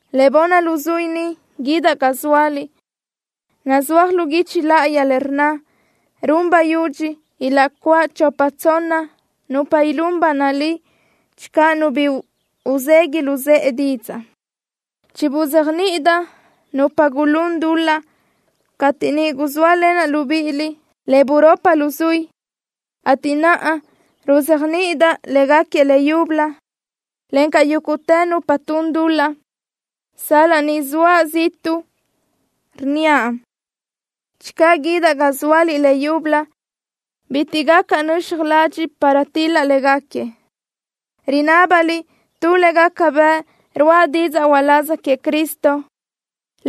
Le bunni luzuí ni guídaʼ ga zóaliʼ. Nazúaj lu guichi láʼayi le rnna: “Run bayudxi ilaʼcuáʼ chopa tsonna nupa ilún ba nalí channö nu bi uzegui luzë́ʼe didzaʼ.” Chibuzéajniʼidaʼ nupa gulún dul-laʼ cateʼ niʼ guzóalenaʼ libíʼiliʼ le buropi luzuí, ateʼ naʼa ruzéajniʼidaʼ légaquiëʼ leyúbölö, encaʼ yúguʼtë nupa tun dul-laʼ, sal-laʼ ni zoaʼ ziʼtuʼ, rnníaʼ: Channö guídaʼ ga zóaliʼ leyúbölö bitiʼ gacaʼ nöxaj ladxiʼ para til-laʼ légaquiëʼ. Rinábaliʼ tu le gaca bëʼ ruáʼa didzaʼ uláz queëʼ Cristo.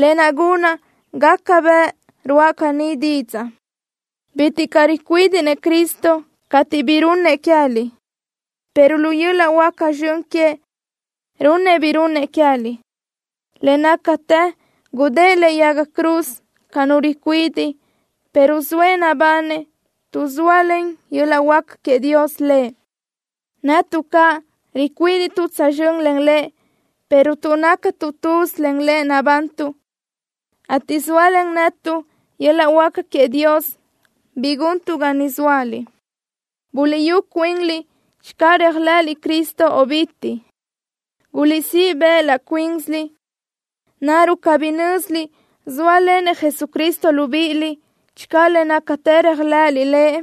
Lë naʼ gunaʼ gaca bëʼ ruáʼa caní didzaʼ. Bitiʼ caʼ ricuídiʼnëʼ Cristo cateʼ bi runëʼ queë́liʼ, pero lu yöl-laʼ huáca zxön queëʼ runëʼ bi runëʼ queë́liʼ. Le nácatë gudë́ʼë lëʼe yaga cruz ca nu ricuidiʼ, pero zoëʼ nabanëʼ tuʼ zóalen yöl-laʼ huáca queëʼ Dios Lëʼ. Netuʼ caʼ ricuídiʼtuʼ tsözxö́n len Lëʼ, pero tuʼ nácatuʼ tuz len Lëʼ nabantuʼ, ateʼ zóalen netuʼ yöl-laʼ huáca queëʼ Dios bi guntuʼ ga niʼ zóaliʼ. Buliʼyú cuinliʼ channö réajlëʼëliʼ Cristo o cabí. Guliʼsíʼ bëʼ laʼ cuínsiliʼ. ¿Naruʼ cabí nö́ziliʼ zóalenëʼ Jesucristo libíʼiliʼ channö le nácatë réajlëʼëliʼ Lëʼ?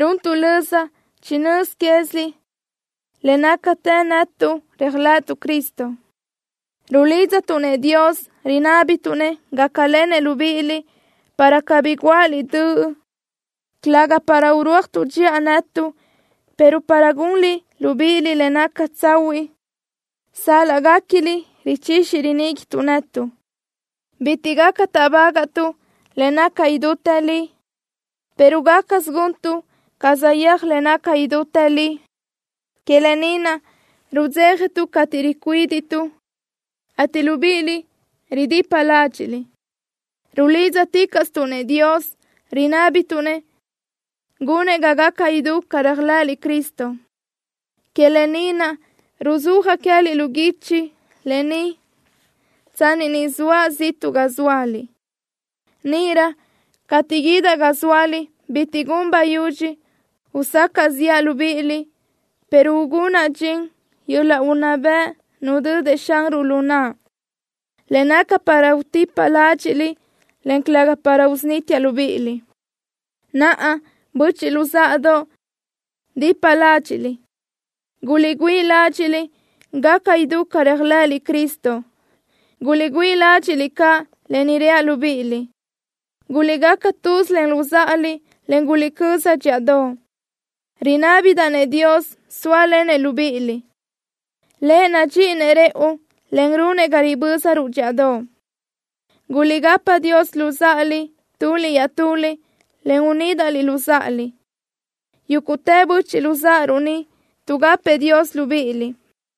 Runtuʼ löza chinö́z quéziliʼ le nácatë netuʼ réajlëʼëtuʼ Cristo. Rulídzatuʼ-nëʼ Dios rinábituʼ-nëʼ gácalenëʼ libíʼiliʼ, para cabí guáʼaliʼ döʼ, calëga para urúajtuʼ dxiʼa netuʼ, pero para gunliʼ libíʼiliʼ le naca tsahuiʼ sal-laʼ guéquiliʼ richixi riníguituʼ netuʼ. Bitiʼ caʼ gaca táʼbagaʼtuʼ le naca idútë li, pero gácasö guntuʼ ca saʼyéaj le naca idútë li. Que lë ni naʼ rudzéjatuʼ cateʼ ricuídiʼtuʼ, ateʼ libíʼiliʼ ridipa ládxiʼliʼ. Rulídzaticaʼstuʼ-nëʼ Dios, rinábituʼ-nëʼ gunëʼ ga gaca idú ca réajlëʼëliʼ Cristo. Que lë ni naʼ ruzúajaʼ queë́liʼ lu guichi lë ni tsanni ni zoaʼ ziʼtuʼ ga zóaliʼ. Níʼirö cateʼ guídaʼ ga zóaliʼ bitiʼ gun bayudxi usacaʼ ziʼa libíʼiliʼ, pero ugunaʼ dxin yöl-laʼ unná bëʼ nudödëʼ Xanruʼ lu naʼa, le naca para utipaʼ ládxiʼliʼ, en calëga para usunítiaʼ libíʼiliʼ. Naʼa, böchiʼ luzáʼadoʼ, dipa ládxiʼliʼ. Guliʼgüíʼ ládxiʼliʼ gaca idú ca réajlëʼëliʼ Cristo. Guliʼgüíʼ ládxiʼliʼ caʼ lë ni reaʼ libíʼiliʼ. Guliʼgaca tuz len luzáʼaliʼ, en guliʼcöza dxíʼadoʼ. Rinábidaʼ-nëʼ Dios sóalenëʼ libíʼiliʼ. Lëʼ nadxíʼinëʼ rëʼu, en runëʼ ga ribö́zaruʼ dxíʼadoʼ. Guliʼgapa Dios luzáʼaliʼ, tuliʼ iaʼtuliʼ, en unídaʼliʼ luzáʼaliʼ. Yúguʼtë böchiʼ luzáʼaruʼ ni tuʼgapëʼ Dios libíʼiliʼ.